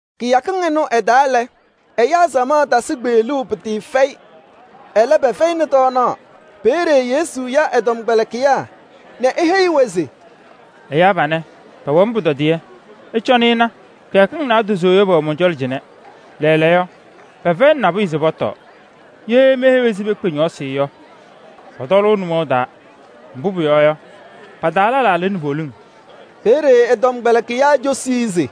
Kɩyakɩŋ ɩnʋ ɩ-taa lɛ, ɛyaa samaɣ tasɩ kpeɣluu pɩtɩɩfɛyɩ, ɛlɛ pɛfɛyɩnɩ tɔɔnaɣ. Peeye Yesu ya ɛ-tɔmkpɛlɩkɩyaa nɛ eheyi-wɛ se: “Ɛyaa panɛ, pɛwɛ-m pʋtɔdɩyɛ. Ɩcɔnɩ ɩna, kɩyakɩŋ naadozo yɔ pɛwɛ mɔn-cɔlɔ cɩnɛ. Lɛɛlɛɛyɔ pɛfɛyɩnɩ nabʋyʋ se pɔtɔɔ. Ye meheyi-wɛ se pekpe ñɔɔsɩ yɔ, pɔtɔlʋʋ nʋmɔʋ taa. Mbʋ pʋyɔɔ yɔ, pa-taa lɛlaa lɩnɩ poliŋ.” Peeye ɛ-tɔmkpɛlɩkɩyaa cosi-i se: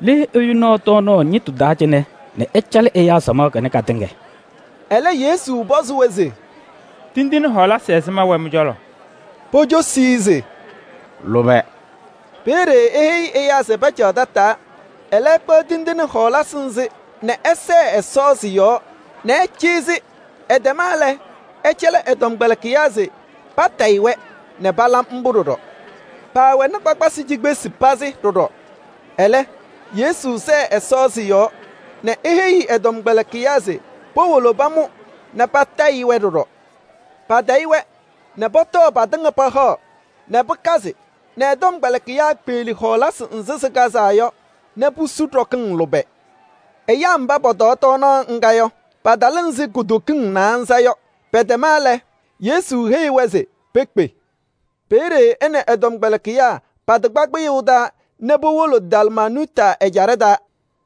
“Le ɛyʋ naɣ tɔɔnaɣ ñɩtʋ taa cɩnɛ nɛ ɛcalɩ ɛyaa samaɣ kanɛ katɩŋa?” Ɛlɛ Yesu pɔzɩ-wɛ se: “Tindine ɛzɩma wɛ mɩ-cɔlɔ?” Pocosi-i se: “Lʋbɛ.” Peeye eheyi ɛyaa se pacaɣ tataa. Ɛlɛ, ɛkpaɣ tindine ana nɛ ɛsɛɛ Ɛsɔ a-yɔɔ nɛ ɛcɩyɩ-yɛ. Ɛtɛma lɛ, ɛcɛlɩ ɛ-tɔmkpɛlɩkɩyaa se patayɩ-wɛ, nɛ pala mbʋ ɖɔɖɔ. Paawɛnɩ kpakpasɩ cikpesi pazɩ ɖɔɖɔ. Ɛlɛ, Yesu sɛɛ Ɛsɔ sɩ-yɔɔ nɛ eheyi ɛ-tɔmkpɛlɩkɩyaa se powolo pamʋ nɛ patayɩ-wɛ ɖɔɖɔ. Patayɩ-wɛ nɛ pɔtɔɔ patɩŋa pahaɣ nɛ pɩkazɩ nɛ ɛ-tɔmkpɛlɩkɩyaa kpeɣli hɔɔlasɩ nzɩ sɩkazaa yɔ nɛ pusu ɖɔkɩŋ lʋbɛ. Ɛyaa mba pɔtɔɔ tɔɔnaɣ ŋga yɔ, patalɩ ɛzɩ kutokiŋ naanza yɔ. Pɛtɛma lɛ, Yesu heyi-wɛ se pekpe. Peeye ɛ nɛ ɛ-tɔmkpɛlɩkɩyaa patɩkpa kpɩyʋʋ taa nɛ powolo Dalmanuuta ɛjaɖɛ taa.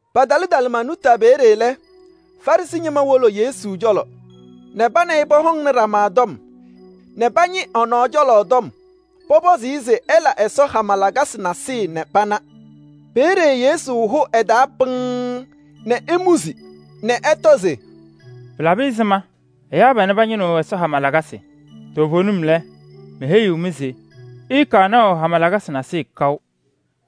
Patalɩ Dalmanuuta peeye lɛ, Farɩsɩ ñɩma wolo Yesu cɔlɔ nɛ pa nɛ ɩ pɔhɔŋnɩ ɖama tɔm nɛ pañɩ ɛ-nɔɔ cɔlɔ tɔm. Pɔpɔzɩ-ɩ se ɛla ɛsɔdaa hama lakasɩ nasɩyɩ nɛ pana. Peeye Yesu hʋ ɛ-taa pɩŋŋ nɛ emuzi nɛ ɛtɔ se: “Pɩlabɩ ɛzɩma ɛyaa panɛ pañɩnɩɣ Ɛsɔ hama lakasɩ? Toovenim lɛ, meheyiɣ-mɩ se ɩɩkaɣ naʋ hama lakasɩ nasɩyɩ kaʋ.”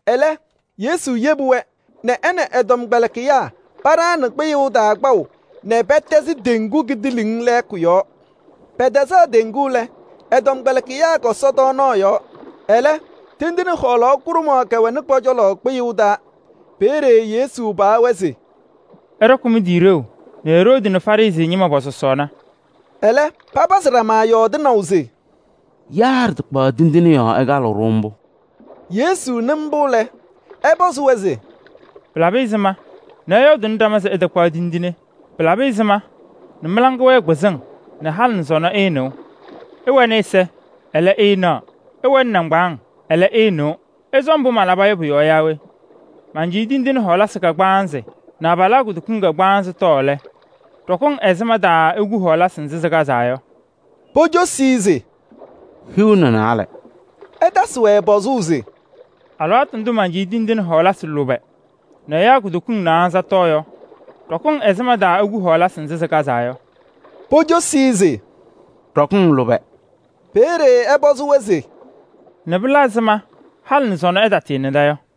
Ɛlɛ, Yesu yebi-wɛ nɛ ɛ nɛ ɛ-tɔmkpɛlɩkɩyaa paɖaɣnɩ kpɩyʋʋ taa kpaʋ nɛ pɛtɛzɩ teŋgu kidiiliŋ lɛɛkʋ yɔɔ. Pɛtɛzaɣ teŋgu lɛ, ɛ-tɔmkpɛlɩkɩyaa kɔsɔ tɔɔnaɣ yɔɔ. Ɛlɛ, tindine kʋɖʋmɖɩyɛ kɛwɛnɩ pɔ-cɔlɔ kpɩyʋʋ taa. Peeye Yesu paɣ-wɛ se: “Ɩɖɔkɩ mɩ-tɩ ɖeu nɛ Eroodi nɛ Farɩsɩ ñɩma pɔ-sɔsɔɔna.” Ɛlɛ papazɩ ɖama yɔɔdɩnaʋ se: “Yaa ɖɩtakpaɣ tindine yɔɔ ɛkalɩɣ-ɖʋ mbʋ.” Yesu nɩ mbʋ lɛ, ɛpɔzɩ-wɛ se: “Pɩlabɩ ɛzɩma nɛ ɩyɔɔdʋʋnɩ ɖama se ɩtakpaɣ tindine? Pɩlabɩ ɛzɩma mɩ-laŋa wɛɛ kpɩzɩŋ nɛ halɩ nɛ sɔnɔ ɩɩnɩɣ? Ɩwɛnɩ ɛza, ɛlɛ ɩɩnaɣ, ɩwɛnɩ nɩŋgbaaŋ, ɛlɛ ɩɩnɩɣ. Ɩsɔ mbʋ malaba yɔ pʋ-yɔɔ yaa we? Mancɩyɩ tindine kagbaanzɩ nɛ abalaa kutokiŋ kagbaanzɩ tɔɔ lɛ, ɖɔkɩŋ ɛzɩma taa iku hɔɔlasɩ nzɩ sɩkazaa yɔ?” Pocosi-i se: “Hiu nɛ naalɛ.” Ɛtasɩ-wɛ pɔzʋʋ se: “Alɩwaatʋ ndʋ mancɩyɩ tindine lʋbɛ nɛ ɛyaa kutokiŋ naanza tɔɔ yɔ, ɖɔkɩŋ ɛzɩma taa iku hɔɔlasɩ nzɩ sɩkazaa yɔ?” Pocosi-i se: “Ɖɔkɩŋ lʋbɛ.” Peeye ɛpɔzɩ-wɛ se: “Nɛ pɩla ɛzɩma halɩ nɛ sɔnɔ ɩtatɩɩnɩda yɔ?”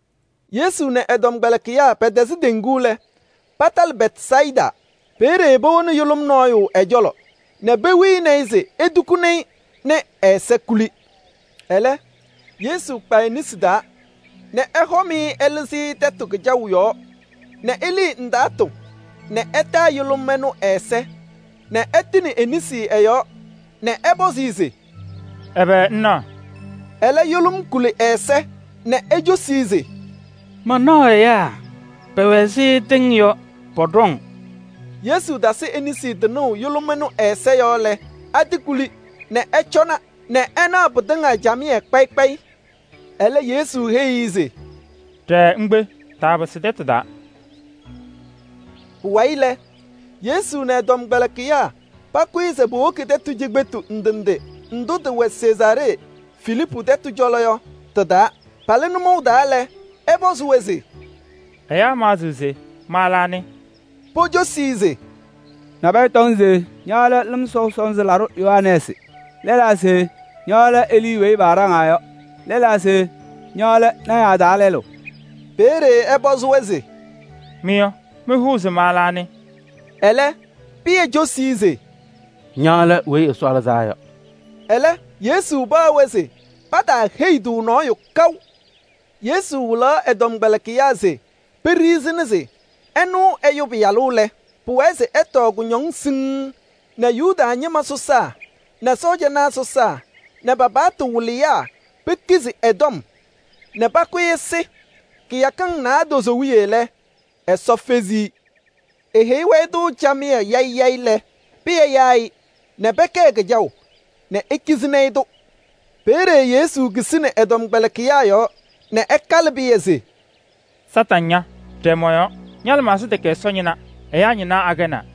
Yesu nɛ ɛ-tɔmkpɛlɩkɩyaa pɛtɛzɩ teŋgu lɛ, patalɩ Bɛtsayɩda. Peeye powoni yʋlʋm nɔɔyʋ ɛ-cɔlɔ nɛ pewini-i se etukuni-i nɛ ɛ-ɛza kuli. Ɛlɛ, Yesu kpa e-nesi taa nɛ ɛhɔm-ɩ ɛlɩzɩ-ɩ tɛtʋ kɩjaʋ yɔɔ nɛ elii ndaatʋ nɛ ɛtaa yʋlʋm ɛnʋ ɛ-ɛza nɛ ɛtɩnɩ e-nesi ɛ-yɔɔ nɛ ɛpɔzɩ-ɩ se: “Ɛbɛ ŋnaɣ?” Ɛlɛ yʋlʋm kuli ɛ-ɛza nɛ ecosi-i se: “Manaɣ ɛyaa, pɛwɛ ɛzɩ tɩŋ yɔ, pɔɖɔŋ.” Yesu tasɩ e-nesi tɩnʋʋ yʋlʋm ɛnʋ ɛ-ɛza yɔɔ lɛ, atɩkuli nɛ ɛcɔna nɛ ɛnaɣ pɩtɩŋa camɩyɛ kpayɩ kpayɩ. Ɛlɛ Yesu heyi-i se: “Ɖɛɛ ŋkpe, taapɩsɩ tɛtʋ taa.” Pʋwayɩ lɛ, Yesu nɛ ɛ-tɔmkpɛlɩkɩyaa pakʋyɩ se powoki tɛtʋ cikpetu ndʋ ndʋ tɩwɛ Sezaaree Filiipu tɛtʋ cɔlɔ yɔ tɩ-taa. Palɩ nʋmɔʋ taa lɛ, ɛpɔzɩ-wɛ se: “Ɛyaa maɣzɩɣ se ma lɛ anɩ?” Pocosi-i se: “Nabɛyɛ tɔŋ se ña lɛ Lɩm Sɔʋ Sɔnzɩ Laɖʋ Yohanɛɛsɩ. Lɛlaa se ña lɛ Elii weyi paaɖaŋaa yɔ nɛ lɛlaa se ña lɛ lɔɔyɩsɩ tɩnaa taa lɛlʋ.” Peeye ɛpɔzɩ-wɛ se: “Mɩ yɔ, mɩhʋʋ se ma lɛ anɩ?” Ɛlɛ, Pɩyɛ cosi-i se: “Ña lɛ Weyi Ɛsɔ Lɩzaa Yɔ.” Ɛlɛ, Yesu paɣ-wɛ se pataaheyi-tʋ nɔɔyʋ kaʋ. Yesu wɩlaɣ ɛ-tɔmkpɛlɩkɩyaa se peɖiɣzini se ɛnʋ Ɛyʋ Pɩyalʋ lɛ, pʋwɛɛ se ɛtɔɔ kʋñɔŋ siŋŋ nɛ Yuda ñɩma sɔsaa nɛ cɔjɔnaa sɔsaa nɛ pa-paɣtʋ wɩlɩyaa pekizi ɛ-tɔm nɛ pakʋ-ɩ ɛsɩ. Kɩyakɩŋ naadozo wiye lɛ, Ɛsɔ fezi-i. Eheyi-wɛ-tʋ camɩyɛ yayɩ yayɩ lɛ, Pɩyɛ yaa-ɩ nɛ pɛkɛɛ kɩjaʋ nɛ ekizini-i-tʋ. Peeye Yesu kisini ɛ-tɔmkpɛlɩkɩyaa yɔɔ nɛ ɛkalɩ Pɩyɛ se: “Kañadʋ Satanɩ ña! Ɖɛɛ mɔ-yɔɔ. Ña-lɩmaɣza tɛkɛ Ɛsɔ ñɩna, ɛyaa ñɩna akɛnaa.”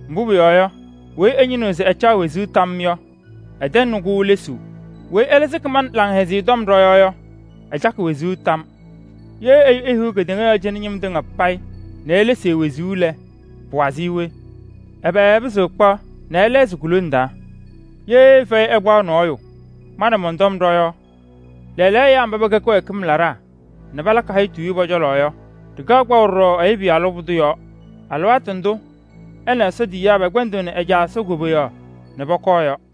Mbʋ pʋyɔɔ yɔ, weyi ɛñɩnɩɣ se ɛcaɣ wezuu tam yɔ, ɛtɛŋnɩ-kʋ lesuu. Weyi ɛlɛ sɩkɩ ma nɛ Laŋhɛzɩyɛ Tɔm ɖɔ-yɔɔ yɔ, ɛcakɩ wezuu tam. Ye ɛyʋ ehiɣ kedeŋa yɔɔ cɩnɛ ñɩm tɩŋa payɩ nɛ elesi e-wezuu lɛ, pɩwazɩɣ-ɩ we? Ɛbɛ ɛpɩzɩɣ ɛkpaɣ nɛ ɛlɛɣzɩ ku-lone taa? Ye fɛyɛ ɛkpa nɔɔyʋ ma nɛ mɔn-tɔm ɖɔ-yɔɔ lɛɛlɛɛyɔ ɛyaa mba pɛkɛ kɩwɛɛkɩm laɖaa nɛ palakɩ hayitu yɔ pɔ-cɔlɔ yɔ, ɖɩkaɣ kpaʋ ɖɔɖɔ Ɛyʋ Pɩyalʋ pʋdʋ yɔɔ, alɩwaatʋ ndʋ ɛ nɛ Ɛsɔ tiyiyaa pɛkpɛndɩɣnɩ ɛ-Caa Ɛsɔ koboyaɣ nɛ pɔkɔɔ yɔ.”